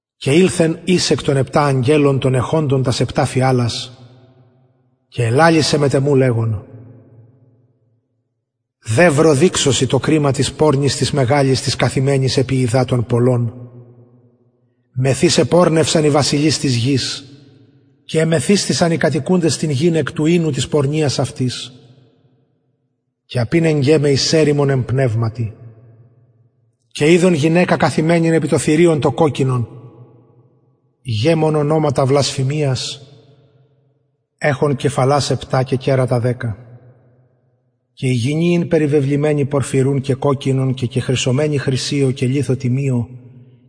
και ηλθεν εις εκ των επτα αγγελων των εχοντων τας επτα φιαλας και ελαλησεν μετ εμου λεγων δευρο δειξω σοι το κριμα της πορνης της μεγαλης της καθημενης επι των υδατων των πολλων μεθ ης επορνευσαν οι βασιλεις της γης και εμεθυσθησαν οι κατοικουντες την γην εκ του οινου της πορνειας αυτης και απηνεγκεν με εις ερημον εν πνευματι και ειδον γυναικα καθημενην επι θηριον κοκκινον γεμον ονοματα βλασφημιας εχον κεφαλας επτα και κερατα δεκα και η γυνη ην περιβεβλημενη πορφυρουν και κοκκινον κεχρυσωμενη χρυσιω και λιθω τιμιω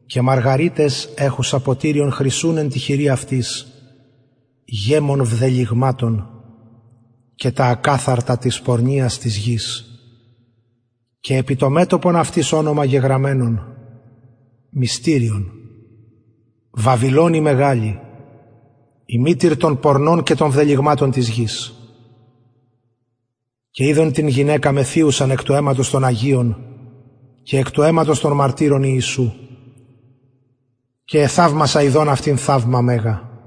και μαργαριταις εχουσα ποτηριον χρυσουν εν τη χειρι αυτης γεμον βδελυγματων και τα ακαθαρτα της πορνειας αυτης και επι το μετωπον αυτης ονομα γεγραμμενον μυστηριον βαβυλων η μεγαλη η μητηρ των πορνων και των βδελυγματων της γης και ειδον την γυναικα μεθυουσαν εκ του αιματος των αγιων εκ του αιματος των μαρτυρων ιησου και εθαυμασα ιδων αυτην θαυμα μεγα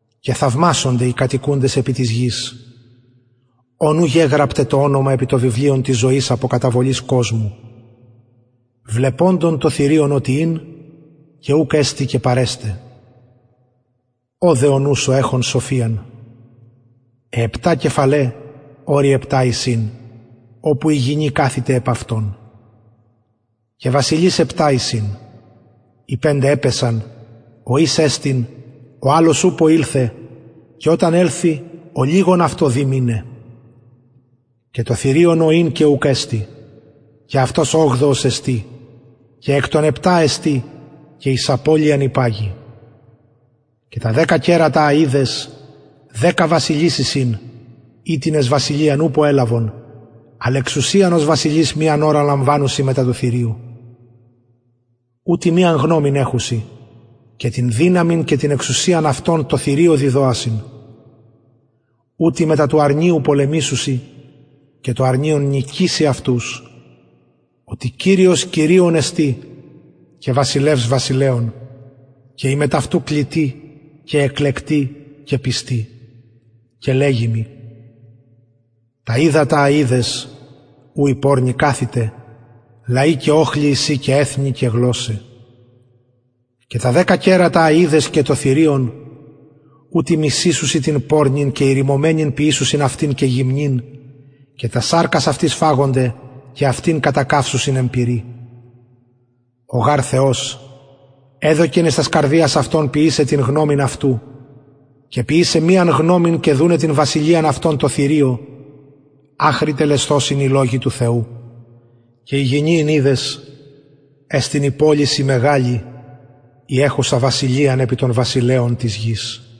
και θαυμασονται οι κατοικουντες επι της γης ων ου γεγραπται τα ονοματα επι το βιβλιον της ζωης απο καταβολης κοσμου βλεποντων οτι ην το θηριον και ουκ εστιν και παρεσται ωδε ο νους ο εχων σοφιαν αι επτα κεφαλαι επτα ορη εισιν οπου η γυνη καθηται επ αυτων και βασιλεις εισιν επτα οι πεντε επεσον ο εις εστιν ο αλλος ουπω ηλθεν και οταν ελθη ολιγον δει αυτον μειναι και το θηριον ο ην και ουκ εστιν και αυτος ογδοος εστιν και εκ των επτα εστιν και εις απωλειαν υπαγει και τα δεκα κερατα α ειδες δεκα βασιλεις εισιν οιτινες βασιλειαν ουπω ελαβον αλλ εξουσιαν ως βασιλεις μιαν ωραν λαμβανουσιν μετα του θηριου ουτοι μιαν εχουσιν γνωμην και την δυναμιν και την εξουσιαν αυτων τω θηριω διδοασιν ουτοι μετα του αρνιου πολεμησουσιν και το αρνιον νικησει αυτους οτι κυριος κυριων εστιν και βασιλευς βασιλεων και οι μετ αυτου κλητοι και εκλεκτοι και πιστοι και λεγει μοι τα υδατα α ειδες ου η πορνη καθηται λαοι και οχλοι εισιν και εθνη και γλωσσαι και τα δεκα κερατα α ειδες και το θηριον ουτοι μισησουσιν την πορνην και ηρημωμενην ποιησουσιν αυτην και γυμνην ποιησουσιν αυτην και τας σαρκας αυτης φαγονται και αυτην κατακαυσουσιν εν πυρι ο γαρ θεος εδωκεν εις τας καρδιας αυτων ποιησαι την γνωμην αυτου και ποιησαι γνωμην μιαν και δουναι την βασιλειαν αυτων τω θηριω αχρι τελεσθωσιν οι λογοι του θεου και η γυνη ην ειδες εστιν η πολις η μεγαλη η εχουσα βασιλειαν επι των βασιλεων της γης